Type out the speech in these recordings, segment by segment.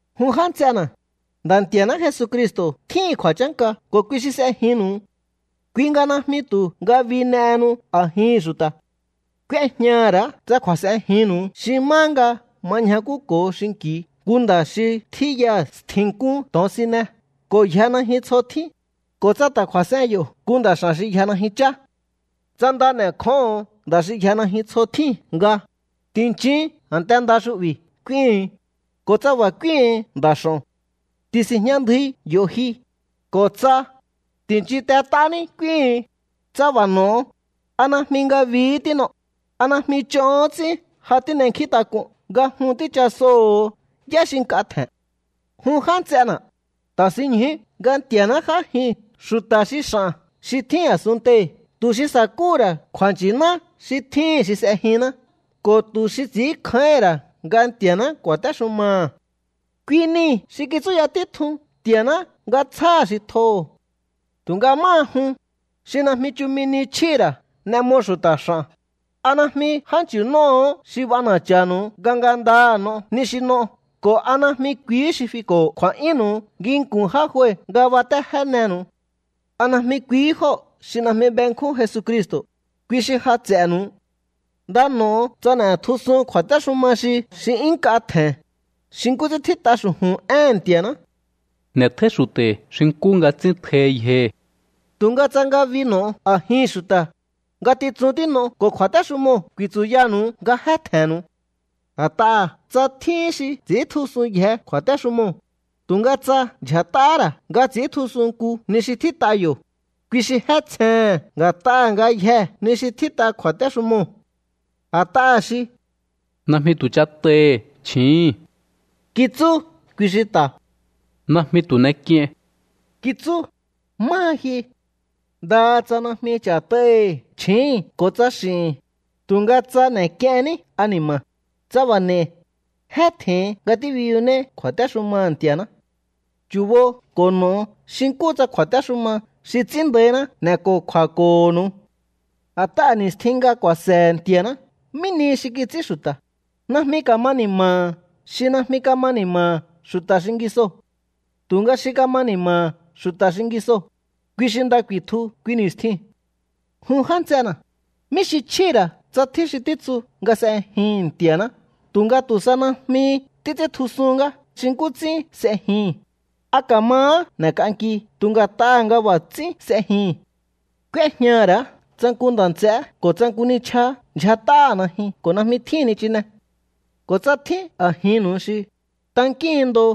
Jun já nts'ena̱, Nda̱ Nti̱a̱ná Jesucristo̱ tjíhi̱n kju̱a̱chánka ko̱ kui xi s'ejinnu̱u. Kui nga najmi tu̱ ngabi n'ehenu a̱jihi̱n xu̱ta̱. K'úéjñaha̱ ra̱á tsa kju̱a̱s'enjinnu̱u xi má nga ma ñjakúko̱o xinki̱u nku nda̱ xi tjíyaha̱ stji̱nk'un to̱onsine ko̱ yja najyun tsjo tjín, ko̱ tsa ta̱ kju̱a̱s'en yo̱ nku nda̱ x'a̱n xi yja najyun chá. Tsa nda n'e̱kjóho̱on nda̱ xi yja najyun tsjo tjíu̱n nga: “Ti̱nchin a̱nte nda xu'bi̱” k'úíhu̱un, ko̱ tsa b'a̱ k'úíhu̱un nda̱ x'o̱n: “Ti̱si̱njña ndjui yo̱ ji” ko̱ tsa: “Ti̱nchintet'ání” k'úíhu̱un, tsa b'a̱ n'o̱o, ¿a najmi ngabihí tín'o? ¿A najmi ch'ohón ts'ín ja tín'enkjíntak'un nga jun tíchasoho̱o yá xi nk'a tje̱n? Jun já nts'ena̱, ta̱sinñjú nga Nti̱a̱ná j'ájin xu̱ta̱ xi x'a̱n xi tjín a̱sunntei̱ tu̱ xi sa̱kúhu̱ ra̱ kju̱a̱nchi̱ná xi tjíhi̱n xi s'ejinná ko̱ tu̱ xi ts'i̱ínkjáíhi̱n ra̱ nga Nti̱a̱ná ku̱a̱téxumaha̱. Kui nii̱ xi kitsúya títjun Nti̱a̱ná nga tsjáha̱ xi tjoho̱. Tu̱nga máha jun, xi najmi chumi ni chjíhi̱ ra̱ n'e mo xu̱ta̱ x'a̱n. ¿A najmi jánchi̱nóo̱hó xi b'ana̱cha̱nu̱u nga ngandaha̱ n'o ni xi n'o ko̱ a najmi kuihí xi fiko̱ kju̱a̱'yúnnu̱u nginku̱n já jue nga batéjénenu̱u? ¿A najmi kuihí jóo̱ xi najmi benkjún Jesucristo̱, kui xi ja ts'e̱nu̱u? Nda n'o̱o tsa n'e̱tjusun kju̱a̱téxuma xi xi 'yún nk'a tje̱n, xi nkú ts'ín tjít'a xu̱ju̱n éhe̱n Nti̱a̱ná: “N'e̱tjóí xu̱ta̱hi̱ xi nkú nga ts'ín tjohi yjohi̱.” Tu̱nga tsa ngabi n'o̱o a̱jihi̱n xu̱ta̱, ngatitsun tín'o ko̱ kju̱a̱téxumoo̱ ku̱i̱tsu̱yanu̱u nga jé tje̱nnu̱u. A̱t'aha̱ tsa tjín xi ts'i̱íntjusunyje kju̱a̱téxumoo̱, tu̱nga tsa ndyja̱t'ahá ra̱ nga ts'i̱íntjusun nku ni xi tjít'a yo̱, kui xi jé tsjehe̱n nga̱t'aha̱ ngayjee̱ ni xi tjít'a kju̱a̱téxumoo̱. A̱t'aha̱ xi: “Najmi tu̱ ch'at'aihi̱ chji̱íhi̱n” kitsú, kui xi ta̱: “Najmi tu̱ n'ek'iein” kitsú. Máha ji, ndaha tsa najmi ch'a̱t'aihi̱ chji̱íhi̱n ko̱ tsa x'i̱hi̱n, tu̱nga tsa n'e̱k'ienní ani̱ma̱, tsa b'a̱ n'e̱i̱, jé tje̱hin nga tíbiyunéí kju̱a̱téxumaha̱ Nti̱a̱ná. Chu̱bo ko̱ n'o̱o xi nkúhu tsa kju̱a̱téxuma xi ts'ín nda̱íná n'e̱ko̱kju̱a̱ko̱ho̱nu̱u. A̱t'aha̱ ni̱stjin nga ku̱a̱se̱he̱ Nti̱a̱ná mí nihi xi kits'ín xu̱ta̱, najmi ka̱ma ni̱ma̱ha̱ xi najmi kama ni̱ma̱ha̱ xu̱ta̱ xingisoo̱. Tu̱nga xi kama ni̱ma̱ha̱ xu̱ta̱ xingisoo̱, kui xi nda ku̱i̱tju kui ni̱stiu̱n. Jun já nts'ena̱, ¿mí xi chjíhi̱ ra̱ tsa tjín xi títsu nga s'ejihi̱n Nti̱a̱ná tu̱nga tu̱ sa najmi títs'íntjusuhún ngá xi nkú ts'ín s'ejihi̱n? ¿A ka̱mahá n'e̱k'anki tu̱ nga̱t'aha̱ nga b'a̱ ts'ín s'ejihi̱n? K'úéjñaha̱ ra̱á tsa nku nda̱ nts'eé ko̱ tsa nku nichjaá ndyjat'áha̱ najyun ko̱ najmi tjíhi̱n nichine. Ko̱ tsa tjín a̱jinnu̱u xi: “Tankíhin ndo,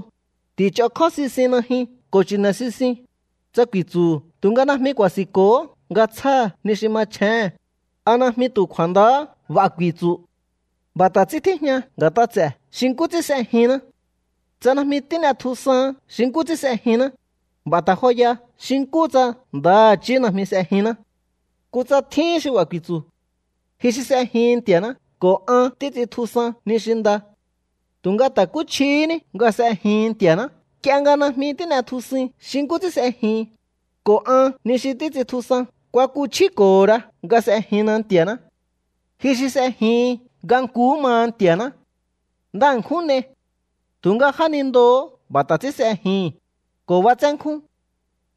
ti̱ch'okjó sisiun najyun ko̱ chi̱ne̱ sisiun”, tsa ku̱i̱tsu̱hu̱ tu̱nga najmi ku̱a̱si̱nko̱hó nga tsjáha̱ ni xi machjéhe̱n, ¿a najmi tu̱ kju̱a̱ndahá b'a̱ ku̱i̱tsu̱? B'a̱ ta̱ ts'ín tíjña nga̱t'a ts'e̱ xi nkú ts'ín s'ejinná. Tsa najmi tín'etjusaán xi nkú ts'ín s'ejinná, b'a̱ ta joya xi nkúhu tsa ndaha̱chí najmi s'ejinná. Kutsa tjíhín xi b'a̱ ku̱i̱tsu̱: “Ji xi s'ejihin Nti̱a̱ná ko̱ an títs'intjusan ni xi nda.” Tu̱nga ta̱kúchjihíní nga s'ejihin Nti̱a̱ná nk'ie nga najmi tín'etjusuin xi nkú ts'ín s'ejihin, ko̱ an ni xi títs'intjusan kuakuchjíko̱ho ra nga s'ejinna Nti̱aṉá. Ji xi s'ejihin nga nkuhú maha Nti̱a̱ná. Nda ṉkjún n'ei. Tu̱nga jánindoo̱hó b'a̱ ta̱ ts'ín s'ejihi̱n, ko̱ b'atsénkjún.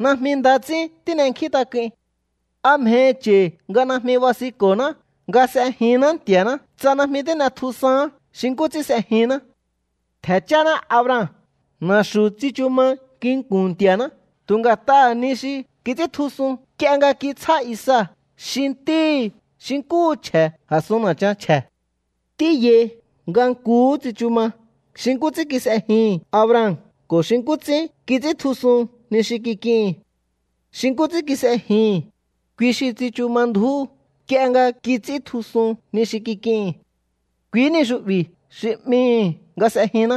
Najmi nda ts'ín tín'enkjíntak'uin. ¿A mjehi cha̱i̱ nga najmi basinko̱ná nga s'ejinná Nti̱a̱ná tsa najmi tín'etjusaán xi nkú ts'ín s'ejinná? Ntje̱ cháná Abraham na̱xu̱ tsichu ma nginku̱n Nti̱a̱ná tu̱ nga̱t'aha̱ ni xi kits'íntjusun nk'ie nga kitsjá Isaac xi ntíhi̱ xi nkúhu chje̱ a̱sun na̱chan chje̱. Tíyai nga nkuhú tsichu ma xi nkú ts'ín kis'ejihi̱n Abraham ko̱ xi nkú ts'ín kits'íntjusun ni xi kik'ihi̱n. Xi nkú ts'ín kis'ejihi̱n, kui xi tsichu ma ndju̱ú nk'ie nga kits'íntjusun ni xi kik'ihi̱n. Kuihí ni xu'bi̱ xi 'mihi̱ nga s'ejinná.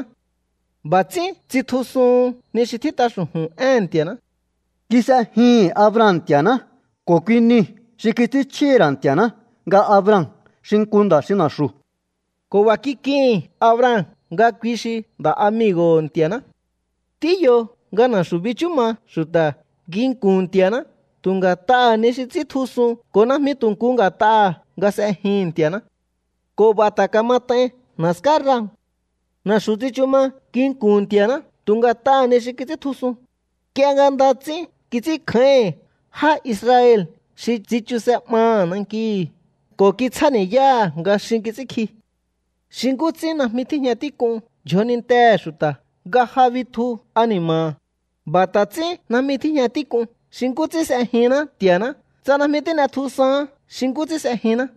B'a̱ ts'ín tsitjusuhun ni xi tjít'a xu̱ju̱n éhe̱n Nti̱a̱ná: “Kis'ejihi̱n Abraham Nti̱a̱ná ko̱ kui niu̱ xi kits'ínchjíhi̱ ra̱ Nti̱a̱ná nga Abraham xi nku nda̱ xi na̱xu̱.” Ko̱ b'a̱ kik'ihi̱n Abraham nga kui xi nda̱'amigo̱ho̱ Nti̱a̱ná. Tíyo nga na̱xu̱ bichú ma xu̱ta̱ nginku̱n Nti̱a̱ná tu̱ nga̱t'aha̱ ni xi ts'íntjusun ko̱ najmi tu̱ nku nga̱t'aha̱ nga s'ejihi̱n Nti̱a̱ná. Ko̱ b'a̱ ta̱ kamat'ain na̱ská Rahab. Na̱xu̱ tsichu ma nginku̱n Nti̱a̱ná tu̱ nga̱t'aha̱ ni xi kits'íntjusun, nk'ie nga nda ts'ín kits'ínkjáíhi̱n já Israel xi tsichuse 'maha̱ nankihi̱ ko̱ kitsjáni̱yáha̱ nga xin kits'ínkji. Xi nkú ts'ín najmi tíjña tík'un yjonintehe̱ xu̱ta̱ nga ja bitju ani̱ma̱ha̱, b'a̱ ta̱ ts'ín najmi tíjña tík'un xi nkú ts'ín s'ejinná Nti̱a̱ná tsa najmi tín'etjusaán xi nkú ts'ín s'ejinná.